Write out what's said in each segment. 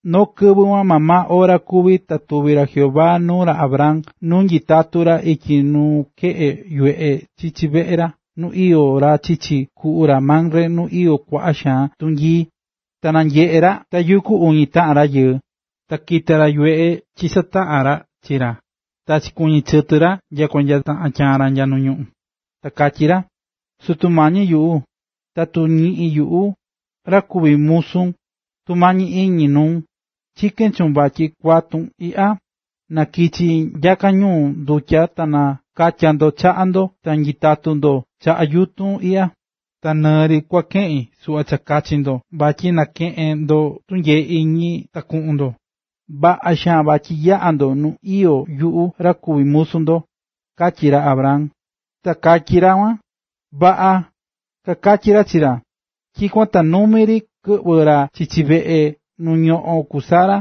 Noo kɨvɨ kuan maa maa ora kuví ta tuvi̱ ra Jehová nuu ra Abraham nu nyitatú ra ityi nukeꞌe yuveꞌe chichi veꞌe nu iyó ra chichi kuꞌu ra Mamre nu iyó kuaꞌa xaan tunyii. Ta nanyeꞌe̱ ra tayukú uñi taꞌan rayɨɨ. Ta kita̱ ra yuveꞌe chisataꞌa̱n ra chi ra, ta chikuɨñɨ̱ chɨtɨ ra nyakua nya taꞌan tyaan ra nu ñuꞌún. Ta katyí ra: ―Sutu mañi yuꞌu, tatu ñiꞌín yuꞌu, ra kuví musun, tumañi iñi nuun, chikén chuun vatyi kuatun iꞌya, na kichi nyaka ñu ndutya ta nakatya ndo chaꞌa ndo ta nyitatu ndo chaꞌa yutun iꞌya. Ta nɨɨ ri kua keꞌin suꞌva cha kachi ndo vatyi nakeꞌen ndo tunyee iñi ta kuꞌun ndo. Vaꞌa xaan vatyi yaꞌá ndo nu iyó yuꞌu ra kuví musu ndo ―katyí ra Abraham. Ta kakatyí ra kuan: ―Vaꞌa ―kakatyí ra chi ra. Tyikuan ta numi ri kɨꞌvɨ̱ ra chichi veꞌe nu ñoꞌón ku Sara,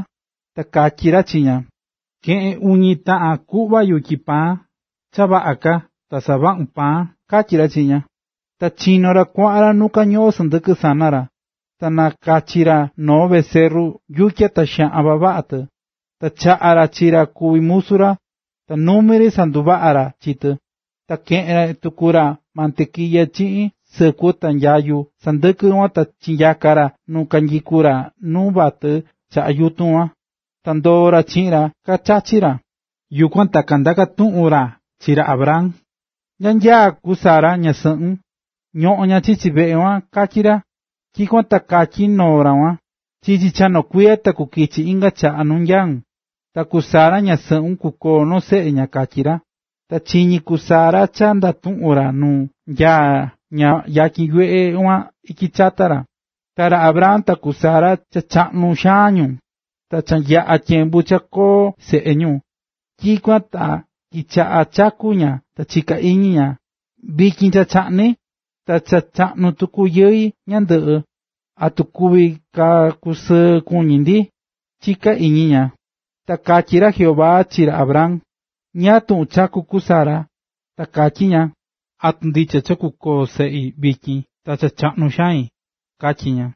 ta katyí ra chi ña: ―Ke̱ꞌen uñi taꞌan kuꞌva yutyi paan cha vaꞌa ka ta savaꞌun paan ―katyí ra chi ña. Ta chinó ra kuaꞌan ra nu kañoꞌón sɨndɨkɨ sana ra, ta nakachi̱ ra noo becerru yutya ta xaꞌan vavaꞌa tɨ. Ta chaꞌa̱ ra chi ra kuví musu ra, ta numi ri sanduvaꞌa̱ ra chi tɨ. Ta keꞌe̱n tuku ra mantequilla chiꞌin sɨkuɨ ta nyayu sandɨkɨ kuan ta chinanyaa̱ ra nu kanyikú ra nu vatɨ chaꞌa yutun kuan. Ta ndoo̱ ra chiꞌin ra nu kachachí ra. Yukuan ta kandaka̱ tuꞌun ra chi ra Abraham: ―¿Nya nyaá ku Sara, ñasɨꞌun? ―Ñoꞌón ña chichi veꞌe ―katyí ra. Tyikuan ta katyí noo ra kuan. ―Chichi cha noo kuiya ta kukichi inga chaꞌa nu nyaún, ta ku Sara, ñasɨꞌun, kukoo noo seꞌe ña―katyí ra. Ta chiñí ku Sara cha ndatuꞌún ra nu nyaá ña yatyin yuveꞌe kuan ityi chata ra. Ta ra Abraham ta ku Sara cha chaꞌnu xaan ñu, ta cha yaꞌa̱ tyembu cha kuví koo seꞌe ñu. Tyikuan ta kichaꞌa̱ chakú ña ta chika̱ iñi ña: “Vityin cha chaꞌni, ta cha chaꞌnu tuku yɨi ñandɨꞌɨ, ¿atu kuvi ka kusɨɨ kuñi ndi?”, chiká iñi ña. Ta katyí ra Jehová chi ra Abraham: ―¿Ñáá tuꞌun chakú ku Sara?, ta katyí ña: “¿Atu ndicha cha kukoo seꞌi vityin, ta cha chaꞌnu xain?”, katyí ña.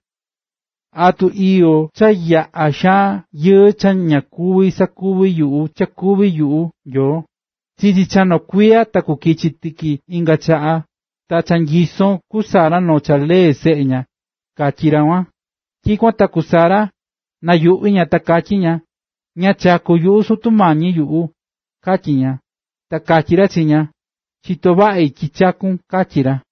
¿Atu iyó cha yaꞌá xaan yɨɨ cha ña kuví sakuvi yuꞌu cha kuvi yuꞌu Nyoo? Chichi cha noo kuiya ta kukichi tiki inga chaꞌa, ta cha nyisó ku Sara noo lee seꞌe ña ―katyí ra kuan. Tyikuan ta ku Sara, nayuꞌví ña ta katyí ña: ―Ña chakú yuꞌu, Sutu mañi yuꞌu ―katyí ña. Ta katyí ra chi ña: ―Chitó vaꞌi tyi chaku̱n ―katyí ra.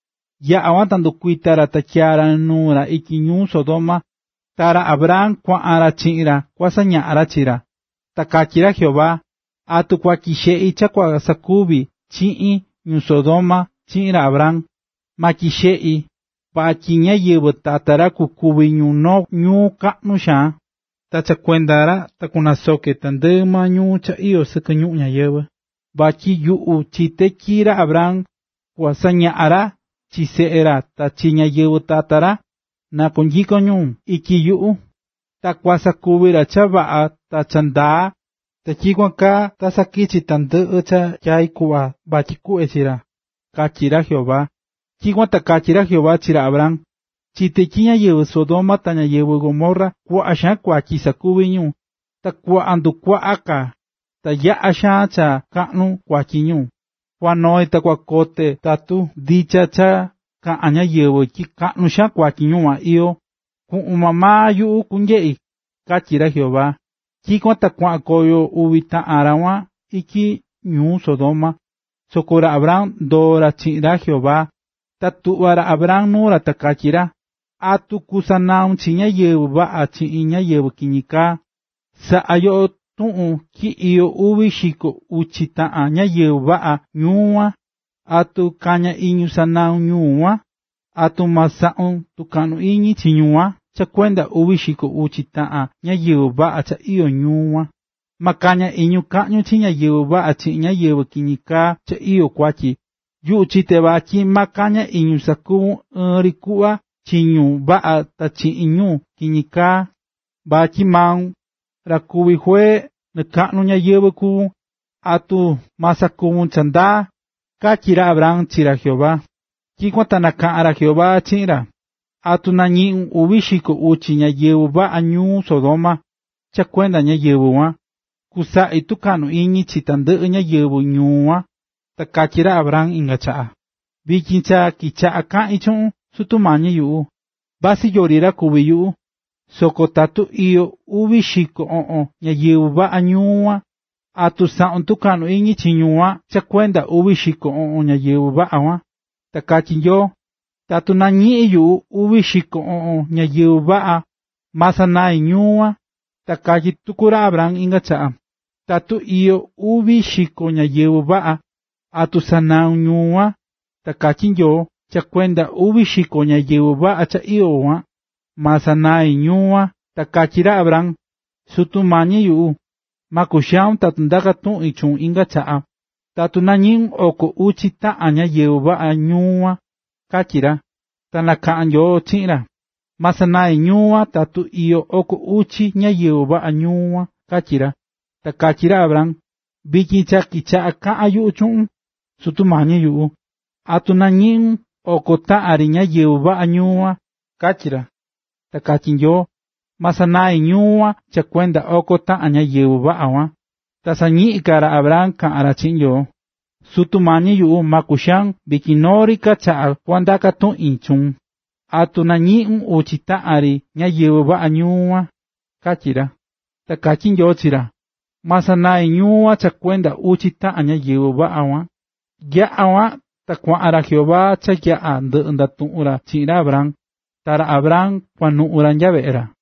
Yaꞌa̱ kuan ta kandukuita̱ ra ta tyaa nuu ra ityi ñuu Sodoma, ta ra Abraham kuaꞌan ra chiꞌin ra kua saña ra chi ra. Ta katyí ra Jehová: “¿Atu tyiꞌí xeꞌi cha kua sakuvi chiꞌin ñuu Sodoma chi ra Abraham? Ma tyiꞌi xeꞌi, vatyi ñáyɨvɨ tata ra kukuvi ñu noo ñuu kaꞌnu xaan, ta cha kuenda ra ta kunasoke tandɨꞌɨ maa ñuu cha iyó sɨkɨ ñuꞌún ñáyɨvɨ. Vatyi yuꞌu chité tyi ra Abraham kua sañaꞌan ra chi seꞌe ra ta chi ñáyɨvɨ tata ra, na kunyikon ñu ityi yuꞌu, ta kua sakuví ra cha vaꞌa ta cha ndaa, ta tyikuan ta sakichi tandɨꞌɨ cha tyai̱ kuꞌva vatyi kuꞌve chi ra”, katyí ra Jehová. Tyikuan ta katyí ra Jehová chi ra Abraham: ―Chite̱ tyi ñáyɨvɨ Sodoma ta ñáyɨvɨ Gomorra kuaꞌa xaan kuatyi sakuví ñu, ta kuaꞌan ndukuaꞌa ka, ta yaꞌa xaan cha kaꞌnu kuatyi ñu. Kua noi ta kua kote tatu ndicha cha kaꞌán ñáyɨvɨ tyi kaꞌnu xaan kuatyi ñuu kuan iyó, kuꞌun maa maa yuꞌu kunyeꞌi ―katyí ra Jehová. Tyikuan ta kuaꞌan koyo uvi taꞌan ra kuan ityi ñuu Sodoma, soko ra Abraham ndoo̱ ra chiꞌin ra Jehová. Ta tuꞌva̱ ra Abraham nuu ra ta katyí ra: ―¿Atu kusanaun chi ñáyɨvɨ vaꞌa chiꞌin ñáyɨvɨ kiñi kaá? Na saꞌa yo tuꞌun tyi iyó uvi xiko uchi taꞌan ñáyɨvɨ vaꞌa ñuu kuan, ¿atu kaña iñun sanaun ñuu kuan? ¿Atu ma saꞌun tukaꞌnu iñi chi ñuu kuan cha kuenda uvi xiko uchi taꞌan ñáyɨvɨ vaꞌa cha iyó kuan? Ma kaña iñun kaꞌñun chi ñáyɨvɨ vaꞌa chiꞌin ñáyɨvɨ kiñi kaa cha iyó kuatyi. ¡Yuꞌu chité vatyi ma kaña iñun sakuvun ɨɨn ri kuꞌva chi ñu vaꞌa ta chiꞌin ñu kiñi kaa! Vatyi maun, ra kuví juee nɨkakaꞌnu ñayɨvɨ̱ kuvún, ¿atu ma sakuvun cha ndaa? ―katyí ra Abraham chi ra Jehová. Tyikuan ta nakaꞌa̱n ra Jehová chiꞌin ra: ―Tatu nañiꞌín uvi xiko uchi ñáyɨvɨ vaꞌa ñuu Sodoma, cha kuenda ñáyɨvɨ kuan, kusaꞌi tukaꞌnu iñi chi tandɨꞌɨ ñáyɨvɨ ñuu kuan. Ta katyí ra Abraham inga chaꞌa: ―Vityin cha kichaꞌa̱ kaꞌín chuꞌun, Sutu mañi yuꞌu, vasɨ yori ra kuví yuꞌu, soko tatu iyó uvi xiko oꞌon ñáyɨvɨ vaꞌa ñuu kuan, ¿atu saꞌun tukaꞌnu iñi chi ñuu kuan cha kuenda uvi xiko oꞌon ñáyɨvɨ vaꞌa kuan? Ta katyí Nyoo: ―Tatu nañiꞌín yuꞌu uvi xiko oꞌon ñáyɨvɨ vaꞌa, ma sanai ñuu kuan. Ta katyí tuku ra Abrahan inga chaꞌa: ―Tatu iyó uvi xiko ñáyɨvɨ vaꞌa, ¿atu sanaun ñuu kuan? Ta katyí Nyoo: ―Cha kuenda uvi xiko ñáyɨvɨ vaꞌa cha iyó kuan, ma sanaí ñuu kuan. Ta katyí ra Abraham: ―Sutu mañi yuꞌu, ma kuxaun tatu ndaká tuꞌin chuun inga chaꞌa, ¿tatu nañiꞌun oko uchi taꞌan ñáyɨvɨ vaꞌa ñuu kuan? ―katyí ra. Ta nakaꞌa̱n Nyoo chiꞌin ra: ―Ma sanai ñuu kuan tatu iyó oko uchi ñáyɨvɨ vaꞌa ñuu kuan ―katyí ra. Ta katyí ra Abraham: ―Vityin cha kichaꞌá kaꞌan yuꞌu chuꞌun, Sutu mañi yuꞌu ¿tatu nañiꞌun oko taꞌan ri ñáyɨvɨ vaꞌa ñuu kuan? ―katyí ra. Ta katyí Nyoo: ―Ma sanai ñuu kuan cha kuenda oko taꞌan ñáyɨvɨ vaꞌa kuan. Ta sañiꞌín ka ra Abraham kaꞌán ra chiꞌin Nyoo: ―Sutu mañi yuꞌu, ma kuxaun, vityin noo ri ka chaꞌa kua ndaka tuꞌin chuun, ¿tatu nañiꞌun uchi taꞌan ri ñáyɨvɨ vaꞌa ñuu kuan? ―katyí ra. Ta katyí Nyoo chi ra: ―Ma sanaí ñuu kuan cha kuenda uchi taꞌan ñáyɨvɨ vaꞌa kuan. Yaꞌa̱ kuan ta kuaꞌan ra Jehová cha yaꞌa̱ ndɨꞌɨ ndatuꞌu̱n ra chiꞌin ra Abraham, ta ra Abraham kuanuꞌu̱ ra nya veꞌe ra.